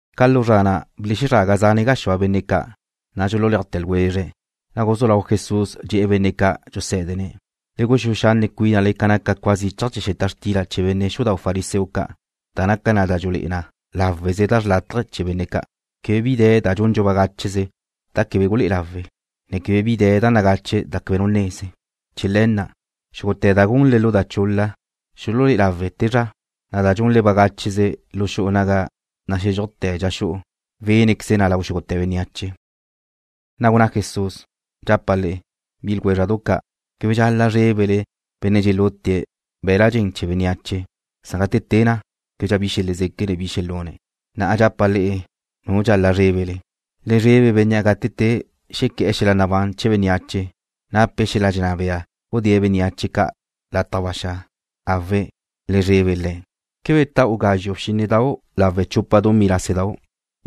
Ca lu zra na' belezraga zane gaxúa benne' ca', na' dxululéajte̱ ljwezre̱'. Na' guzú lau Jesús dxe̱'e̱ benne' ca' dxusé̱dene̱': ―Le guxúe xanne' cuínale ca naca cua zichaj chee̱ xeta xtila chee̱ benne' xudau' fariseo ca', da naca na da dxulé'e na láweze da xrlátaje chee̱ benne' ca'. Quebe bi de̱ da dxundxu bagácheze da quebe gulé'e lawe', ne quebe bi de̱ da nagache da quebe nu neze. Chee̱ le̱ na', xúgute̱ da gunle lu da chul-la, xululé'e lawe' te zra, na' da gunle bagácheze lu xu'u naga naxézxujte̱ dxa xu'u, wénqueze na lau xúgute̱ bénneache. Na' gunná Jesús: ―Dxapa' le'e, bi ljwézra'du ca', quebe dxal-la' zrébele benne' dxelute be̱la' dxen chee̱ bénneache, san gate te na', québedxa xelezéquene̱' bi xelune̱'. Na'a dxapa' le'e nu dxal-la' zrébele. Le zrebe Bénnea' gate te xequé̱'e̱ xel-la nabán chee̱ bénneache, nape̱' xel-la dxenná bea gudée̱' bénneache ca' lataj ba xa'. Awe', Le̱' le zrebe. ’¿Quebe ta'u gazxu' bxínnedau' lawe' chupa dumí lásedau'?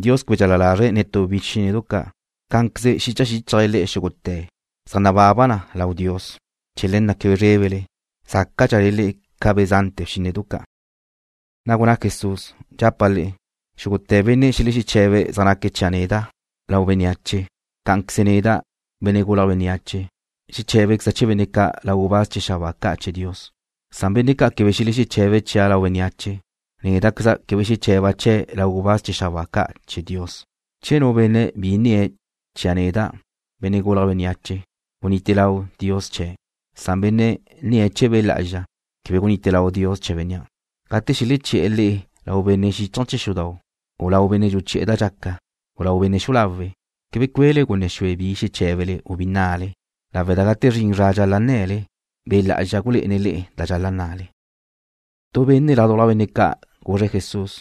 Dios quebe dxal-la lazre̱' netú bxínnedu ca'. Cá'anqueze xicha xíchajle le'e xúgute̱ na zaj nababa na lau Dios. Chee̱ le̱ na' quebe zrébele. Zácadxale le'e ca be̱ zante̱ bxínnedu ca'. Na' gunná Jesús: ―Dxapa' le'e, xúgute̱ benne' xelexeche̱be̱' zaj naque̱' chia' neda' lau bénneache, cá'anqueze neda', Benne' Gulje̱' Bénneache, xeché̱bequeza' chee̱ benne' ca' lau gubáz chee̱ xabáa ca' chee̱ Dios, san benne' ca' quebe xelexeche̱be̱' chia' lau bénneache, néda'queza' quebe xeche̱ba' chee̱' lau gubáz chee̱ xabáa ca' chee̱ Dios. ’Che nu benne' bi nnie̱' chia' neda', Benne' Gulje̱' Bénneache, gunite lau Dios chee̱', na' benne' nnie̱' chee̱ Be' Lá'azxa, quebe gunite lau Dios chee̱ bénnea'. ’Gate xeleché̱'e̱ le'e lau benne' xíchaje̱ chee̱ xudau', u lau benne' dxuchi'e̱ da dxaca, u lau benne' xu'u lawe', quebe cue'le gunne xue bi xeché̱bele u bi nnale, lawe' da gate zrin zra dxal-la' nne̱le, Be' Lá'azxa gulé'ene̱' le'e da dxal-la' nne̱le. Tu benne' ládujla benne' ca' guzre̱' Jesús: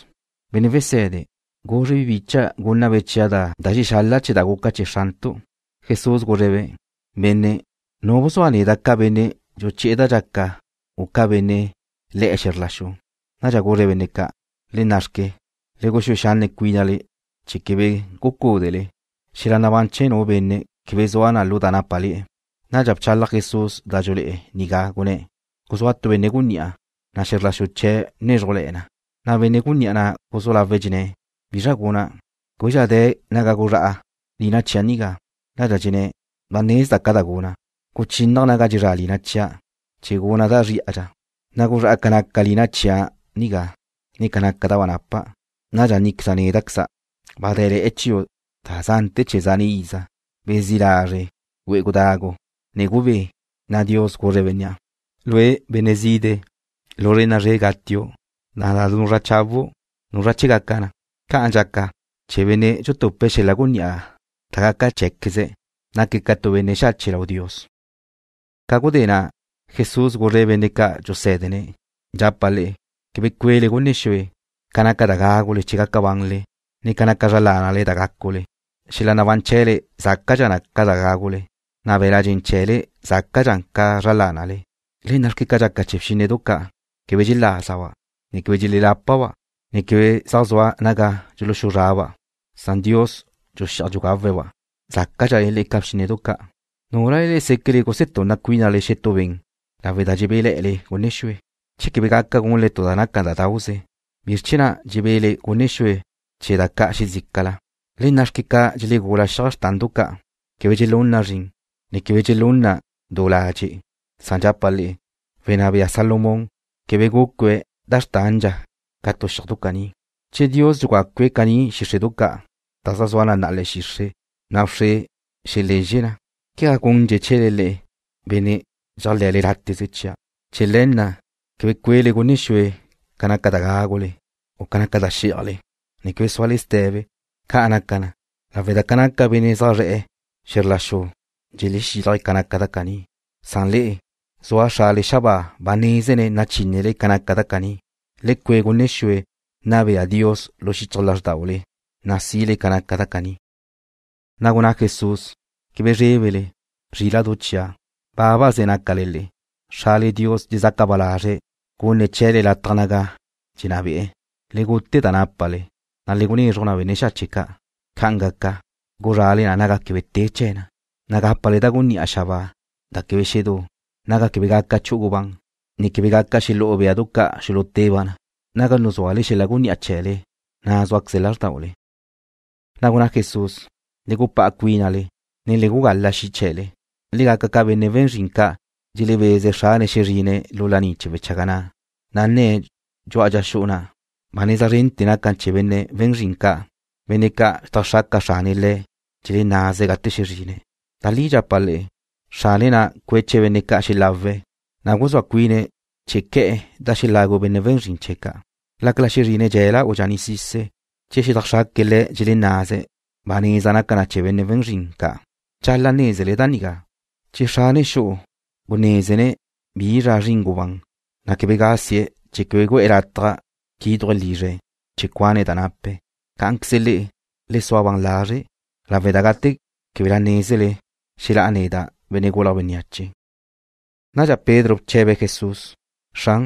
―Benne' Wese̱de, guzre bi bicha' gúnnabe' chia' da xexal-la' chee̱ da guca chee̱ xrantu'. Jesús guzre̱'-be': ―Benne', ¿zua nu bzua neda' ca benne' dxuchi'e̱ da dxaca u ca benne' le̱'e̱ xe̱zr la xu? Nadxa guzre̱' benne' ca': ―¡Le na' xque! ¡Le guxúe xanne' cuínale chee̱ quebe gucúdele! Xel-la nabán chee̱ nu benne' quebe zua na lu da nápale̱'e̱. Nadxa bchalaj Jesús da dxulé'e nigá, gunné̱': ―Guzúa tu benne' gunní'a, na' xe̱zr la xu chee̱' bnézrujle̱'e̱ na. Na' benne' gunní'a na' guzú lawe̱' dxenné̱': ¿Bizra guna'? Québedxa de̱ naga guzrá'a lina chia' nigá. Nadxa dxenné̱': “¡Ba nezda' ca da guna'! Guchínnaja' naga dxezrá' lina chia', chee̱ guna' da zrí'adxa, na' guzrá'a na' ca naca lina chia' nigá, ne ca naca da ba napa'. Nadxa nníqueza' néda'queza': Ba dé̱le̱'e̱ chiu' da zante̱ chee̱ zane' iza. Bezí' lazre'. Güe'e gudagu, ne gubé.” Na' Dios guzre̱' bénnea': “Lue', benne' zide', lu zre' na'a zre' gatiu', na' da nuzrá' chawu', quebe nézenu' nu chee̱ gaca na.” Ca'an dxaca chee̱ benne' dxutupe̱' xel-la gunní'a da gaca cheé̱queze̱'. Naque̱' ca tu benne' xache' lau Dios. Ca gudé na', Jesús guzre̱' benne' ca' dxusé̱dene̱': ―Dxapa' le'e, quebe cue'le gunne xue ca naca da gágule chee̱ gaca banle, ne ca naca zra lánale da gácule. Xel-la nabán chee̱le zácadxa na ca da gágule, na' be̱l-la' dxen chee̱le zácadxa na ca zra lánale. Le nna'xque ca dxaca chee̱ bxínnedu ca'. Quebe dxelázaba', ne quebe dxelelápaba', ne quebe zaj zua naga dxuluxuzraba', na' Diósqueze̱' dxuxi'aj dxugawe̱'-ba'. Zácadxale le'e ca bxínnedu ca'. ¿Núlale le'e séquele gusetunna cuínale xetú ben lawe' da dxebé'le̱'e̱le gunne xue? Che quebe gaca gunle tu da naca da dauze, ¿bizr chee̱ na' dxebe'le gunne xue chee̱ da ca' xezícala? ’Le nna'xque ca dxelegula xiaj xrtandu ca'. Quebe dxelún na zrin, ne quebe dxelún na du ladxe', na' dxapa' le'e, wenná bea Salomón quebe gucue̱' da xrtandxa ca tu xiajdu caní. Che Dios dxugacue̱' caní xíxre'du ca', da zaj zua na'a le̱'e̱ xixre', na' wxre xelezxe na, ¿quegá gundxe̱' chee̱le le'e, benne' dxeléajle̱'e̱ láteze chia'? Chee̱ le̱ na', quebe cue'le gunne xue ca naca da gágule, u ca naca da xí'ajle, ne quebe súale ste̱be. Ca' naca na, lawe' da ca naca benne' ca' zaj zre̱'e̱ xe̱zr la xu dxelexílaje̱' ca naca da caní, san le'e, zua Xrale xabáa ba nézene̱' nachínnele ca naca da caní. Le cue' gunne xue nna bea Dios lu xichaj lázrdaule, na' sile ca naca da caní. Na' gunná Jesús: ―Quebe zrébele, zríla'du chia', bábaze nácale le'e. Xrale Dios dxezaca ba lazre̱' gunne̱' chee̱le lataj naga dxenná be'e̱. Le gute da nápale, na' le gunezruj benne' xache' ca'. Ca'an gaca, guzrale na naga quebe te chee̱ na, na' gápale da gunní'a xabáa da quebe xedú, naga quebe gaca chu'u gubán, ne quebe gaca xelú'u béadu ca' xuluteba' na. Naga nuzúale xel-la gunní'a chee̱le, na' súaqueze lázrdaule. Na' gunná Jesús: ―Le gupá'a cuínale, ne le gugala xi' chee̱le. Le gaca ca benne' we̱n zrin ca' dxelebeze̱' xrane̱' xezrine̱' lu laní chee̱ wechaga na', na' nne̱' dxu'a dxa xu'u na'. Ba neza zrente̱ naca na chee̱ benne' we̱n zrin ca', benne' ca' xedajxraca xrane̱' le̱' dxelenaze̱' gate xezrine̱'. Da li dxapa' le'e, xrane̱' na' cueche̱' benne' ca' xelawe̱', na' guzúa cuine̱' chee̱ que̱'e̱ da xelagu benne' we̱n zrin ca'. Lácala xezrine̱' dxe̱la u dxaní'sise̱', che xedajxraque̱' le̱' dxelennaze̱', ba neza naca na chee̱ benne' we̱n zrin ca'. Dxal-la' nézele da nigá, che xrane xu'u gunézene̱' bi zra zrin gubán, na' quebe gasie̱' chee̱ quebe gu'e̱ lataj quíduje̱' lizre̱' chee̱ cuane̱' da nape̱'. Cá'anqueze le'e, le sua ban lazre', lawe' da gate québela nézele, xelá'a neda', Benne' Gulje̱' Bénneache. Nadxa Pedro bche̱be̱' Jesús: ―Xran,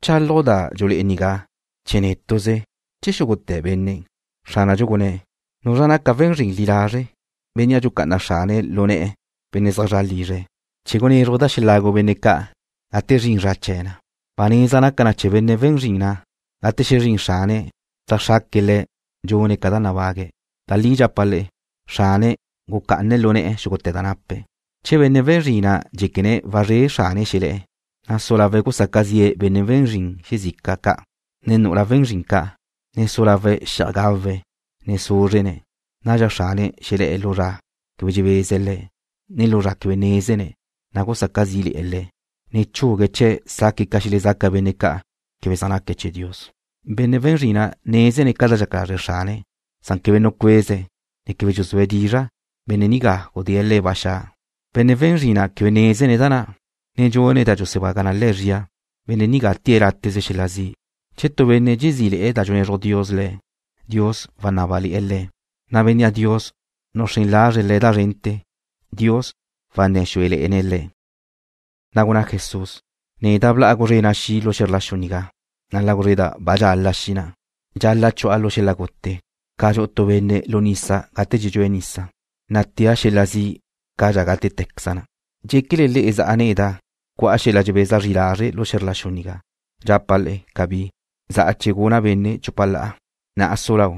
¿bchálaju' da dxulé'e nigá chee̱ nétu'ze, che chee̱ xúgute̱ benne'? Xránadxu gunné̱': ―¿Nuzra naca we̱n zrin li lazre', bénnea' dxucá'ana xrane̱' lu ne̱'e̱ benne' zaj zra' lizre̱' chee̱ gunézruje̱' da xelagu benne' ca' gate zrin zra chee̱ na? Ba neza naca na chee̱ benne' we̱n zrin na', gate xezrín xrane̱', xedajxraque̱' le̱' dxune̱' ca da nabague̱'. Da li dxapa' le'e, xrane̱' gucá'ane̱' lu ne̱'e̱ xúgute̱ da nape̱'. Che benne' we̱n zrin na' dxéquene̱' wazré xrane̱' xelé̱'e̱, ne su lawe̱' gusaca zi'e̱ benne' we̱n zrin xezica ca', ne nu'ula we̱n zrin ca', ne su lawe̱' xi'aj gawe̱', ne súzrene̱', nadxa xrane̱' xelé̱'e̱ lu zra quebe dxebeze̱' le̱', ne lu zra quebe nézene̱', na' gusaca zí'le̱'e̱ le̱', ne chugue̱' chee̱' saque̱' ca xelezaca benne' ca' quebe zaj naque̱' chee̱ Dios. ’Benne' we̱n zrin na' nézene̱' ca da dxaca lazre' xrane̱' san quebe nucueze̱', ne quebe dxuzúe̱' dizra', benne' nigá gudée̱' le̱' ba xa'. Benne' we̱n zrin na' quebe nézene̱' da na', ne dxune̱' da dxusebaga na le̱' zria, benne' nigá tée̱' láteze xel-la zi'. Che tu benne' dxezí'le̱'e̱ da dxunezruj Dios le̱', Dios wanábale̱'e̱ le̱, na' bénnea' Dios nuxrén lazre̱' le̱' da zrente̱, Dios wanné̱ xúele̱'e̱ne̱' le̱'. Na' gunná Jesús: ―Neda' bla'a guzrena' xi' lu xe̱zr la xu nigá, na' la guzreda' ba dxala xi' na'. Dxal-la' chu'a lu xel-la gute ca dxu'u tu benne' lu nisa gate dxedxúe̱' nisa, na' téle̱'a xel-la zi' cadxa gácatequeze na. ¿Dxéquele le'e za' neda' cu'a xel-la dxebeza zri lazre' lu xe̱zr la xu nigá? Dxapa' le'e: Cabí. Za'a chee̱ guna' benne' chupa la'a. Na'a su lau,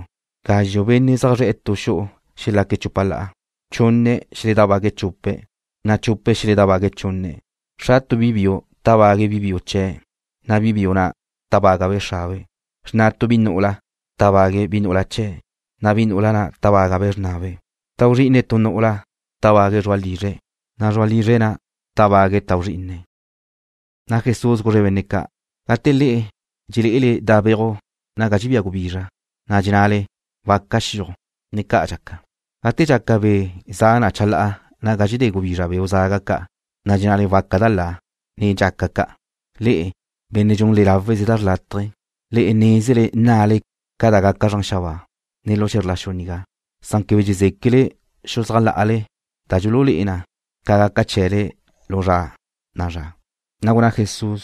gazxu' benne' zaj zre̱'e̱ tu xu'u xelaque̱' chupa la'a. Chunne̱' xeledábague̱' chupe̱', na' chupe̱' xeledábague̱' chunne̱'. Xra tu bi biu tábague̱' bi biu chee̱', na' bi biu na' tábagabe' xrabe'. Xrna tu bi nu'ula tábague̱' bi nu'ula chee̱', na' bi nu'ula na' tábagabe' xrnabe'. Tau zri'ine tu nu'ula tábague̱' zru'a lizre̱', na' zru'a lizre̱' na' tábague̱' tau zrí'ine̱'. Na' Jesús guzre̱' benne' ca': ―Gate le'e dxelé'ele da' beuj naga dxebía gubizra, na' dxennale, waca xiuj, ne ca' dxaca. Gate dxaca be' za na chalá'a naga dxedé gubizra beu' zaga ca', na' dxennale waca da la, ne dxaca ca'. Le'e, benne' dxunle láweze da xrlátaje. Le'e nézele nnale ca da gaca zran xabáa, ne lu xe̱zr la xu nigá, san quebe dxezéquele xuzájla'ale da dxululé'e na ca gaca chee̱le lu zra na'a zra. Na' gunná Jesús: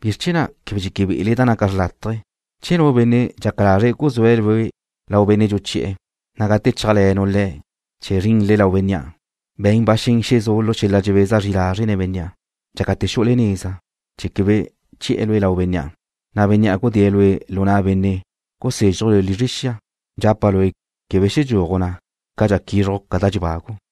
―¿Bizr chee̱ na' quebe dxeque be'ele da naca xrlátaje? Che nu benne' dxaca lazre̱' guzúe̱' lue' lau benne' dxuchi'e̱, na' gate chéajle̱nu' le̱' chee̱ zrinle lau bénnea', be̱n ba xen xezú' lu xel-la dxebeza zri lazre' nen bénnea' dxácate̱ xu'ule neza, chee̱ quebe che̱'e̱ lue' lau bénnea', na' bénnea' gudée̱' lue' lu na' benne' gusézxuje̱' lue' lizre xia. Dxapa' lue' quebe xedxúaju' na' cadxa quízruju' ca da dxebagu'.